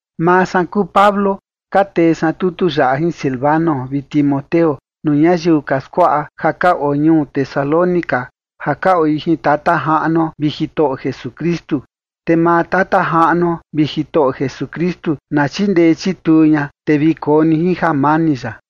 Maa san kuu Pablo, ka tee san tutu yaꞌa jin Silvano vi Timoteo nuu ñayiu ka skuaꞌa ja ka oo ñuu Tesalónica ja ka oi jin Tata Jaꞌnuo vi Jitoꞌo Jesukristu. Te maa Tata Jaꞌnuo vi Jitoꞌo Jesukristu na chindee chituu ña, te vi koo ni jin jamani ya.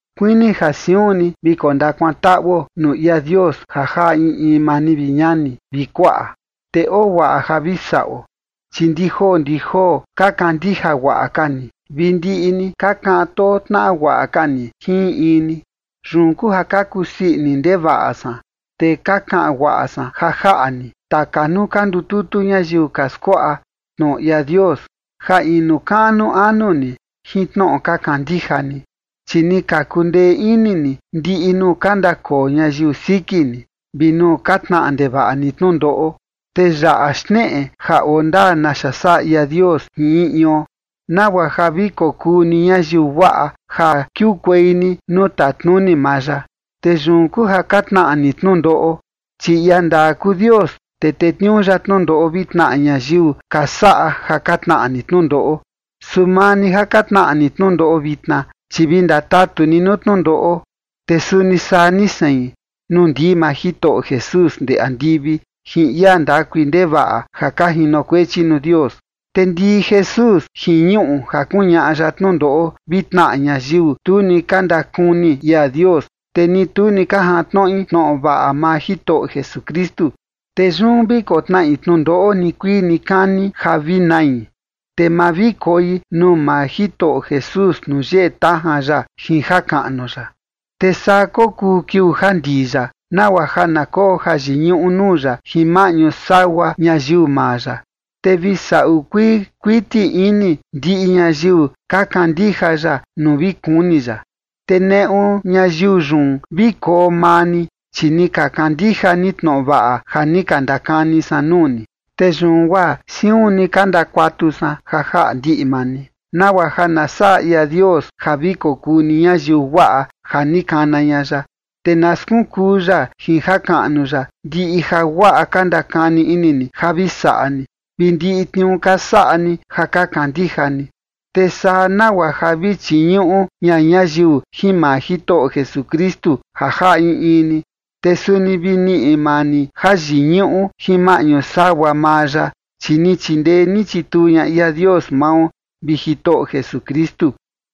Kuini ja siun ni vi kondakuantaꞌuo nuu ia Dios ja jaꞌa in in maa ni, vi ñani vi kuaꞌa, te oo guaꞌa ja vi saꞌo, chi ndi joo ndi joo ka kandija guaꞌa ka ni, vi ndiꞌi ni ka kaꞌan too tnaꞌa guaꞌa ka ni jin in in ni. Yun kuu ja ka kusii ini ndevaꞌa san, te ka kaꞌan guaꞌa san ja jaꞌa ni taka nuu ka ndututu ñayiu ka skuaꞌa tnoꞌo ia Dios ja inu kaꞌnu anu ni jin tnoꞌo ka kandija ni, chi ni ka kundee ini ni ndiꞌi nuu ka ndakoo ñayiu siki ni, vi nuu ka tnaꞌa ndevaꞌa ni tnundoꞌo. Te yaꞌa xneꞌe ja oo ndaa naxa saꞌa ia Dios jin in ion, nagua ja vi kokuu ni ñayiu guaꞌa ja kiukuei ni nuu tatnuni maa ya, te yun kuu ja ka tnaꞌa ni tnundoꞌo. Chi ia ndaa kuu Dios, te tetniuu ya tnundoꞌo vi tnaꞌa ñayiu ka saꞌa ja ka tnaꞌa ni tnundoꞌo. Su maa ni ja ka tnaꞌa ni tnundoꞌo vitna, chi vi ndatatu ni nuu tnundoꞌo, te suni saa ni sein, nuu ndii maa Jitoꞌo Jesús ndee andivi jin ia ndakui ndevaꞌa ja ka jinokuechi nuu Dios. Te ndii Jesús jin ñuꞌu ja kuñaꞌa ya tnundoꞌo vi tnaꞌa ñayiu tu ni ka ndakuni ia Dios, te ni tu ni ka jantnoꞌi tnoꞌo vaꞌa maa Jitoꞌo Jesukristu. Te yun vi kotnaꞌi tnundoꞌo nikuii nikani ja vi nai, te ma vi koi nuu maa Jitoꞌo Jesús nuu yeꞌe tajan ya jin jakaꞌnu ya. Te saa kokuu kiuu ja ndii ya, nagua ja na koo jayiñuꞌu nuu ya jin maꞌñu sagua ñayiu maa ya, te vi saꞌu kuii kuiti ini ndiꞌi ñayiu ka kandija ya nuu vi kuni ya. Te neꞌu ñayiu yun vi koo maa ni, chi ni ka kandija ni tnoꞌo vaꞌa ja ni ka ndakani san nuu ni. Te yun guaa siun ni ka ndakuatu san ja jaꞌa ndiꞌi maa ni, nagua ja na saꞌa ia Dios ja vi kokuu ni ñayiu guaꞌa ja ni kana ña ya, te na skunkuu ya jin jakaꞌnu ya ndiꞌi jaguaꞌa ka ndakani ini ni ja vi saꞌa ni, vi ndiꞌi tniuu ka saꞌa ni ja ka kandija ni. Te saa nagua ja vi chiñuꞌu ña ñayiu jin maa Jitoꞌo Jesukristu ja jaꞌa in in ni, te suni vi niꞌi maa ni jayiñuꞌu jin maꞌñu sagua maa ya, chi ni chindee ni chituu ña ia Dios mao vi Jitoꞌo Jesukristu.